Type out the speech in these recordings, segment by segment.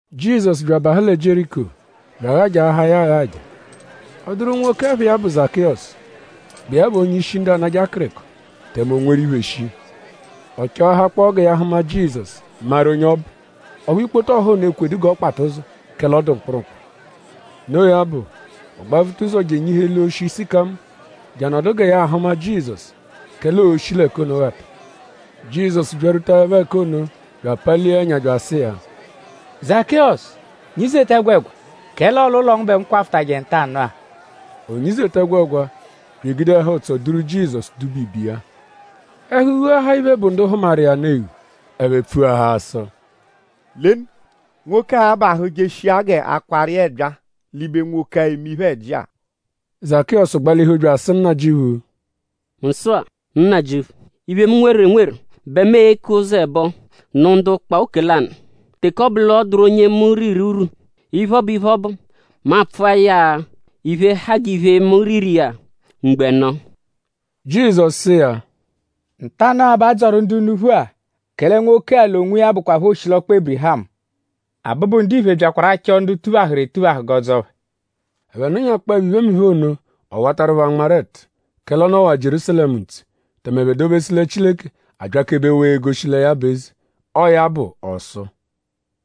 Jizọsu bya abahụ lẹ Jieriko; bya aghajaahaa ya aghaja. Ọ dụru nwoke, ẹpha iya bụ Zakịyosu, bụ iya bụ onye-ishi ndu anajẹ akịriko; tẹme o nweru iphe shii. Ọ chọahakpoo gẹ ya hụma Jizọsu, maru onye ọ bụ; ọphu ikpoto ọha ono ekwedu g'ọ kpata ụzo; kẹle ọ dụ mkpụrukpu. Noo ya bụ; ọ gbavuta ụzo je enyihu eli oshi sịkamo; je anọdu gẹ ya ahụma Jizọsu; kẹle oo-shi l'ẹka ono ghata. Jizọsu byarwutaẹpho ẹka ono bya apalia ẹnya bya asụ iya: “Zakịyosu; nyizeta ẹgwegwa; kẹle ọo l'ụlo ngu bẹ mu kwafụtaje ntanụ-a.” O nyizeta ẹgwegwa bya egude ẹhu-ụtso duru Jizọsu duba ibe iya. Ẹhu ghuahaa iphe, bụ ndu hụmaru iya nụ eghu. Ẹphe pfuahaa sụ: “Lenu; nwoke-a abahụ jeshia g'a kwaaru iya ẹbyaa l'ibe nwoke-a, eme iphe-ẹji-a.” Zakịyosu gbalihu bya asụ Nnajịuphu: “Mu sụ-a; Nnajịuphu; iphe, mu nweru enweru bẹ mu e-ke ụzo ẹbo; nụ ndu ụkpa oke lanụ. Teke ọ bụ l'ọ dụru onye mu riru urwu; iphe, ọ bụ iphe, ọ bụ; mu a-pfụa ya iphe, ha g'iphe, mu riru iya mgbo ẹno.” Jizọsu sụ iya: “Ntanụ-a bẹ a dzọru ndu unuphu-a; kẹle nwoke-a l'onwiya bụkwapho oshilọkpa Ébirihamu. Abụbu-Ndiphe byakwaru achọ ndu tuphahụru etuphahụ g'ọo-dzọo phẹ.” Ẹphe nụnyakpoepho iphemiphe ono; ọ watarụ phẹ anmarụ ẹtu; kẹle ọ nọwa Jierúsalẹmu ntse; tẹme ẹphe dobesu lẹ Chileke abyakebewaa egoshi lẹ ya bụ eze. Ọo ya bụ ọ sụ: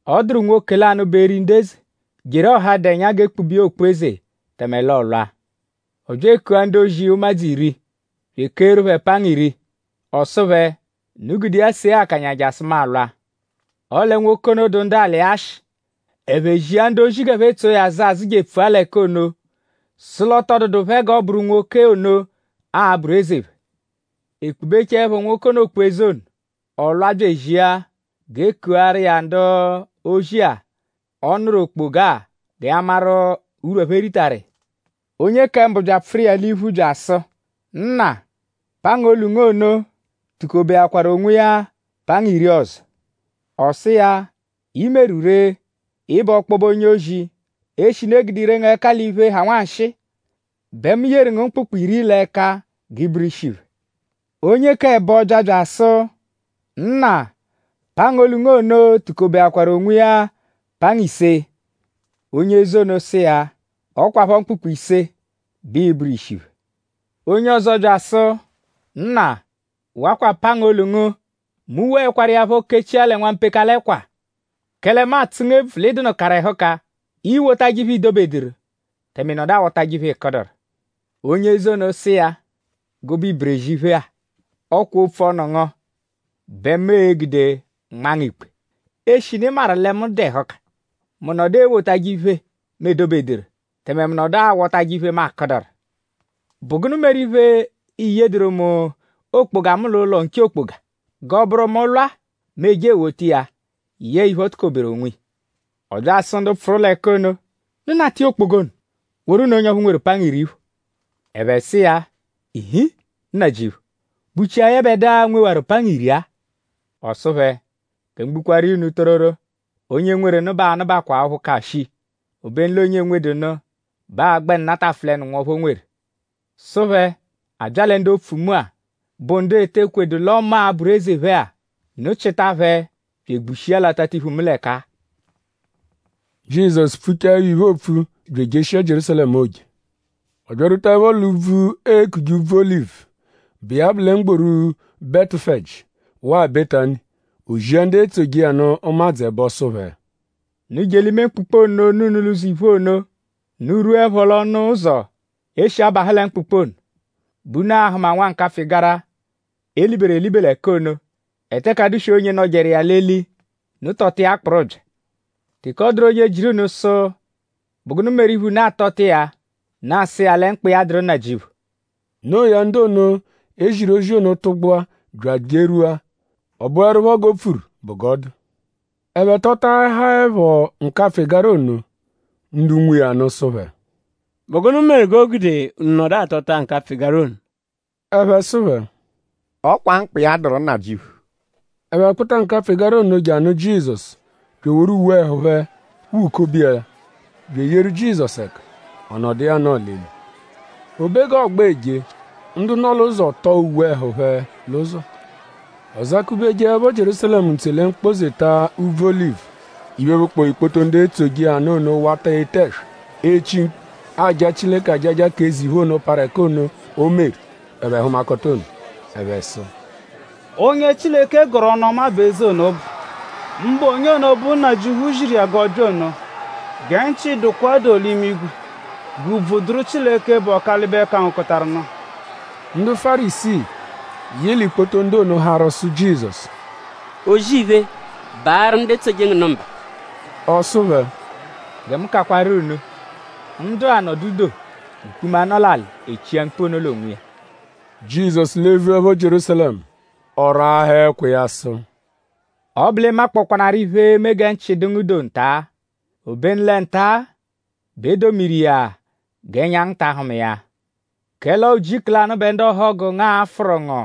“Ọ dụru nwoke lanụ, bụ eri ndu eze, jeru ọha, dụ ẹnya; g'e kpube iya okpu-eze tẹme l'ọolwa. Ọ bya ekua ndu-ozi iya ụmadzu iri bya ekeeru phẹ pangu iri. Ọ sụ phẹ: ‘Unu gude iya see akanya jasụ mu a-lwa.’ Ọle nwoke ono dụ ndu alị iya ashị. Ẹphe zia ndu-ozi g'ẹphe tso iya azụ azụ je epfua l'ẹka ono; sụ l'ọ tọ dụdu phẹ g'ọ bụru nwoke ono, a-bụru eze phẹ. “E kpubechaẹpho nwoke ono okpu-eze ono; ọ lwa bya ezia g'e kuaru iya ndu-ozi-a, ọ nụru okpoga-a gẹ ya maru urwu, ẹphe ritaru iya. Onye kẹ mbụ bya apfụru iya l'iphu bya asụ: ‘Nna; pangu olu ngu ono tukobeakwaru onwiya pangu iri ọzo.’ Ọ sụ iya: ‘I meru ree! Ị bụ ọkpobe onye-ozi. Eshinu e gude ire ngu ẹka l'iphe, ha nwanshịi bẹ mu yeru ngu mkpụkpu iri l'ẹka; g'ị bụru ishi phẹ.’ Onye k'ẹbo bya bya asụ: ‘Nna; pangu olu ngu ono tukobeakwaru onwiya pangu ise.’ Onye eze ono sụ iya: ‘Ọ kwaphọ mkpụkpu ise bẹ ịi-bụru ishi phẹ.’ Onye ọzo bya asụ: ‘Nna; wakwa pangu olu ngu. Mu woẹkwaru iya phọ kechia lẹ nwampekala ẹkwa; kẹle mu atsụ ngu ebvu l'ị dụnukaru ẹhuka. Iiwotajẹ iphe, i dobeduru; tẹme ị nọdu awọtaje iphe, ị kụduru.’ “Onye eze ono sụ iya: ‘Gụbe iberezi iphe-a! Ọ kwa opfu-ọnu ngu bẹ mu e-gude nmaa ngu ikpe. Eshinu ị maru lẹ mu dụ ẹhuka; mu nọdu ewotajẹ iphe, mu edobeduru; tẹme mu nọdu awọtaje iphe, mu akụduru. ?Bụ gụnu meru iphe, i yedụru mu okpoga mu l'ụlo nche okpoga; g'ọo-bụru: mu -lwa mu eje ewota iya yẹe iphe, o tukoberu onwiya?’ Ọ bya asụ ndu pfụru l'ẹka ono: ‘Unu nata iya okpoga ono woru nụ onye ọphu nweru pangu iri phọ.’ Ẹphe sụ iya: ‘Ii-nhi Nnajịuphu!?Bụchia yẹbedua, nwewaru pangu iri-a?’ Ọ sụ phẹ: ‘Gẹ mu gbukwaaru iya unu tororo; onye nweru nụ bẹ aa-nụbakwaa ọphu ka shii. Obenu l'onye enwedu nụ bẹ aa-gbẹnu natafụlenu nwọphu o nweru.’ Sụ phẹ: ‘A bya lẹ ndu opfu mu-a, bụ ndu ete ekwedu l'ọo mu a-bụru eze phẹ-a; unu chịta phẹ bya egbushia l'atatiphu mu l'ẹka-a.’” Jizọsu pfuchaẹpho iphe, oopfu bya ejeshia Jierúsalẹmu, oo-je. Ọ byarwutaẹpho l'úbvú, eekuje Úbvú-Olivu, bụ iya bụ lẹ mgboru Betufeji; waa Betani; o zia ndu etsoje iya nụ ụmadzu ẹbo sụ phẹ: “Unu je l'ime mkpụkpu ono, nọ unu l'ụzo iphu ono. Unu -rwuẹpho l'ọnu ụzo, e shi abahụ lẹ mkpụkpu ono bẹ unu a-hụma nwa nkapfụ-ịgara, e liberu elibe l'ẹka ono, e teke adụ-swe onye nọjeru iya l'eli. Unu tọta iya kpụru bya. Teke ọ dụru onye jịru unu sụ: ‘?Bụ gụnu meru iphe, unu atọta iya?’ Unu asụ iya lẹ mkpa iya dụru Nnajịuphu.” Noo ya; ndu ono, e ziru ozi ono tụgbua bya ejerwua; ọ bụerupho g'o pfuru bụ g'ọ dụ. Ẹphe tọtaahaepho nkapfụ-ịgara ono; ndu nwe iya nụ sụ phẹ: “?Bụ gụnu meru g'o gude unu nọdu atọta nkapfụ-ịgara ono?” Ẹphe sụ phẹ: “Ọ kwa mkpa iya dụru Nnajịuphu.” Ẹphe kpụta nkapfụ-ịgara ono je anụ Jizọsu; bya eworu uwe ẹhu phẹ wukobe iya; bya eyeru Jizọsu ẹka; ọ nọdu iya anọo l'eli. O be g'ọogba eje; ndu nọ l'ụzo tọo uwe ẹhu phẹ l'ụzo. Ọ zakubejeẹpho Jierúsalẹmu ntse lẹ mkpọ-zeta úbvú Olivu; iphe, bụkpoo ikpoto ndu etsoje iya nụ ono wata ete ẹswa; echi mkpu; aja Chileke ajaja k'eze iphe ono, parụ ẹka ono, o meru; ẹphe hụmakota ono. Ẹphe sụ: “Onye Chileke gọru ọnu-ọma bẹ eze ono bụ; mbụ onye ono, bụ Nnajịuphu ziru iya g'ọ bya ono. Gẹ nchị dụkwa doo l'imigwe; g'ùbvù dụru Chileke, bụ Ọkalibe-kangokọtaru-nụ.” Ndu Fárisii, yị l'ikpoto ndu ono harụ sụ Jizọsu: “O-zì-iphe! Baarụ ndu etsoje ngu nụ mba.” Ọ sụ phẹ: “Gẹ mu kakwaru unu: ndu-a -nọdu doo; mkpuma, nọ l'alị echia mkpu ono l'onwiya.” Jizọsu levuẹpho Jierúsalẹmu; ọ raahaa ẹkwa iya sụ: “Ọ -bụ l'ị makpọkwanaaru iphe, e-me gẹ nchị dụ ngu doo nta; obenu lẹ nta-a bẹ e domiru iya g'ẹnya ngu ta ahụma iya. Kẹle ọo ujiku lanụ bẹ ndu ọhogu ngu aa-fụru ngu;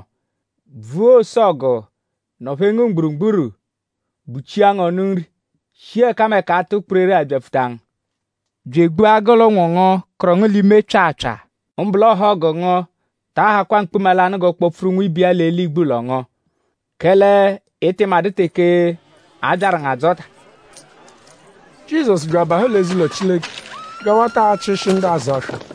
bvua ose-ọgu; nọ-phee ngu mgburugburu; buchia ngu ọnu nri; shi ẹkameka atụ kpereree abyapfuta ngu; bya egbua gụ l'ụnwu ngu, kụru ngu l'ime pyaapyaa. Mbụ l'ọhogu ngu taa hakwa mkpuma lanụ g'ọ kpọ-pfuru nwibe iya l'eli igbulọ ngu; kẹle ị tị madụ teke a byaru ngu adzọta.” Jizọsu bya abahụ l'eze-ụlo Chileke bya awata achịshi ndu azụ aswa.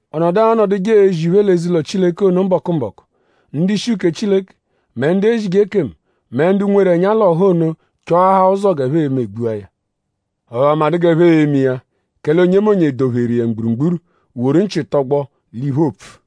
Ọ nọdu anọduje ezi iphe l'eze-ụlo Chileke ono mbọku-mbọku. Ndu-ishi uke Chileke; mẹ ndu ezije ekemu; mẹ ndu nweru ẹnya l'ọha ono chọahaa ụzo g'ẹphe e-me gbua ya. Ọphu ẹphe amadụ g'ẹphe e-me iya; kẹle onyemonye dọ-pheru iya mgburugburu; woru nchị tọgbo l'iphe, oo-pfu.